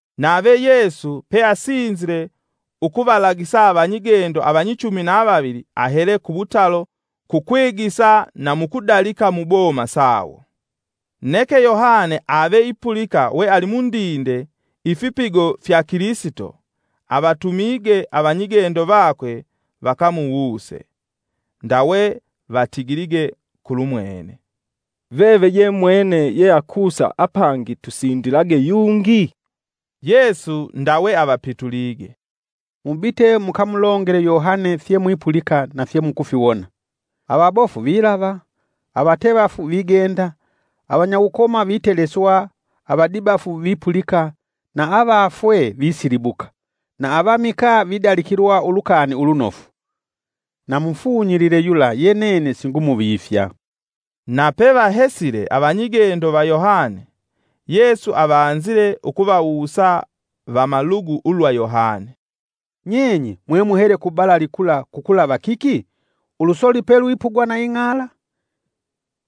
Nave Yesu peasinzile ukuvalagisa avanyigendo avanyichumi na vavili ahele kuwutalo kukwigisa na mukudalika muboma sawo. Neke Yohane ave ipulika we ali mundinde ifipigo fya Kilisito, avatumige avanyigendo vakwe vakamuwuse. Ndawe vatigilige kulumwene, “Veve ye mwene ye akusa apangi tusindilage yungi?” Yesu ndawe avapitulige, “Mubite mukamulongele Yohane fye mwipulika na fye mukufiwona: Avabofu vilava, avatevafu vigenda, avanyawukoma viteleswa, avadibafu vipulika na avafwee visilibuka, na avamikaa vidalikilwa Ulukani Ulunofu. Na mufunyilile yula ye nene singumuvifya.” Nape vahesile avanyigendo va Yohane, Yesu avanzile ukuvawusa vamalugu ulwa Yohane, “Nyenye mwemuhele ku balali kula kukulava kiki? Ulusoli pelwipugwa na ing'ala?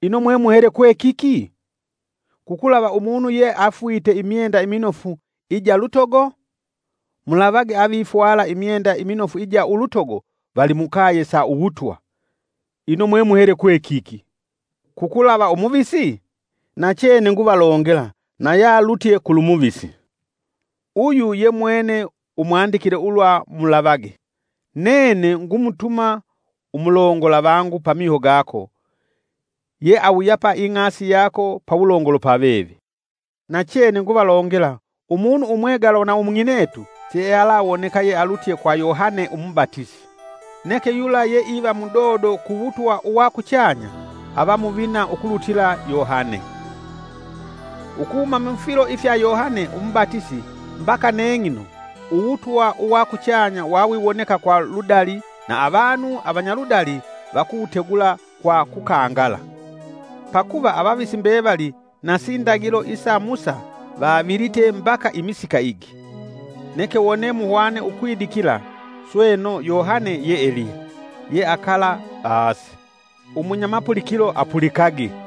Ino mwemuhele kwekiki? Kukulava umunu ye afwite imyenda iminofu ija lutogo? Mulavage avavifwala imyenda iminofu ija ulutogo vali mukaye sa uwutwa. Ino mwemuhele kwe kiki? Kukulava umuvisi? Nachene nguvalongela na yalutye kulumuvisi. “Uyu ye mwene umwandikile ulwa mulavage, ‘Nene ngumutuma umulongola vangu pamiho gako, ye awuyapa ing'asi yako pawulongolo pa veve.’ Nachene nguvalongela umunu umwegalwa na umung'inetu, siealawoneka yealutye kwa Yohane umubatisi. Neke yula ye iva mudodo ku wutwa uwa kuchanya ava muvina ukulutila Yohane. Ukuhuma mufilo ifya Yohane umubatisi mbaka neng'ino uwutwa uwa kuchanya wa wiwoneka kwa ludali na avanu avanyaludali vakuwutegula kwa kukangala. Pakuva avavisi mbevali na sindagilo isa Musa vavilite mbaka imisika igi. Neke wone muhwane ukwidikila, sweno Yohane ye Eliya, yeakala ase. Umunya mapulikilo, apulikage!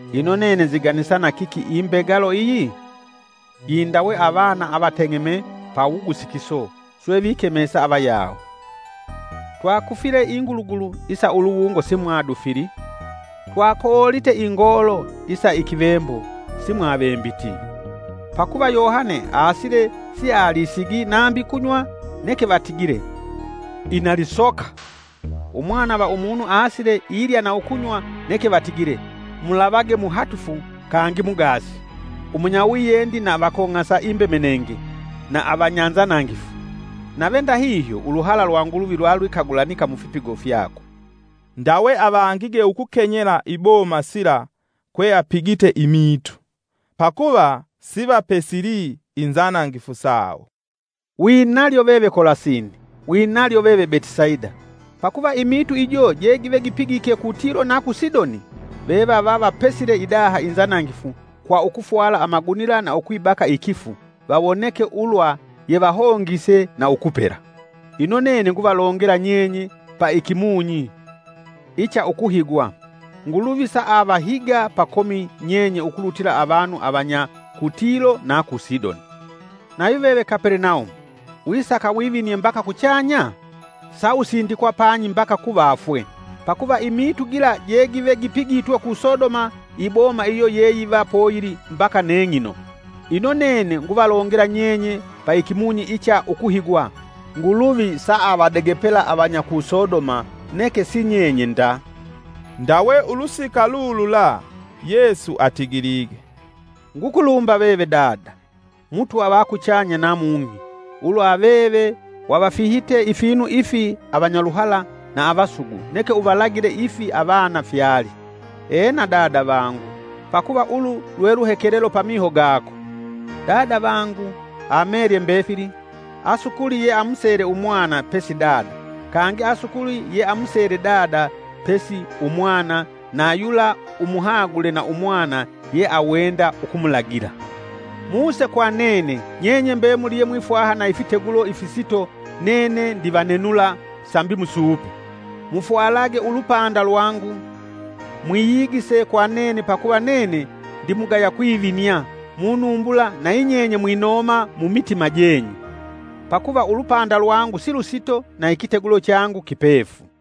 “Ino nene nziganisa na kiki imbegalo iyi? Yi ndawe avana avateng'eme pa wugusikiso swe vikemesa avayawo: ‘Twakufile ingulugulu isa uluwungo si mwadufili. Twakoolite ingoolo isa ikivembo simwavembiti!’ Pakuva Yohane aasile sialisigi nambi kunywa neke vatigile ‘Ina lisoka.’ Umwana va umunu aasile ilya na ukunywa neke vatigile, ‘Mulavage muhatufu kangi mugaasi, umunya wiyendi na avakong'asa imbemenenge na avanya nzanangifu!’ Nave ndahihyo uluhala lwa Nguluvi lwalwikagulanika mufipigo fyakwe.” Ndawe avangige ukukenyela iboma sila kwe apigite imiitu, pakuva sivapesili inzanangifu sawo. “Winalyo veve Kolasini! Winalyo veve Betisaida! Pakuva imiitu ijo je give gipigike ku Tilo na ku Sidoni, vevava vapesile idaha inzanangifu kwa ukufwala amagunila na ukwibaka ikifu vawoneke ulwa yevahongise na ukupela. Ino nene nguvalongela nyenye pa ikimunyi, icha ukuhigwa, Nguluvi saavahiga pakomi nyenye ukulutila avanu avanya ku Tilo na ku Sidoni. Nayu veve Kapelenaumu, wisaka wivinie mbaka kuchanya? Sa usindikwa panyi mbaka ku vafwe! Pakuva imiitu gila je givegipigitwe ku Sodoma iboma iyo yeyiva poyili mbaka neng'ino. Ino nene nguvalongela nyenye paikimunyi icha ukuhigwa, Nguluvi alavadegepela avanya ku Sodoma neke sinyenye nda.” Ndawe ulusika lulula Yesu atigilige, “Ngukulumba veve Dada, Mutwa va kuchanya na mung'i, ulwa veve wavafihite ifinu ifi avanyaluhala na avasugu neke uvalagile ifi avana fyali. Ena, Dada vangu, pakuva ulu lwe luhekelelo pamiho gako.” “Dada vangu amelye mbefili. Asukuli ye amusele umwana pesi Dada, kangi asukuli yeamusele Dada pesi umwana na yula umuhagule na umwana ye awenda ukumulagila. Muse kwa nene, nyenye mbemuli ye mwifwaha na ifitegulo ifisito nene ndivanenula sambi musuupe. Mufwalage ulupanda lwangu, mwiyigise kwa nene pakuva nene ndimugaya kwivinia munumbula na yinyenye mwinoma mumitima jenyu. Pakuva ulupanda lwangu silusito na ikitegulo changu kipefu.”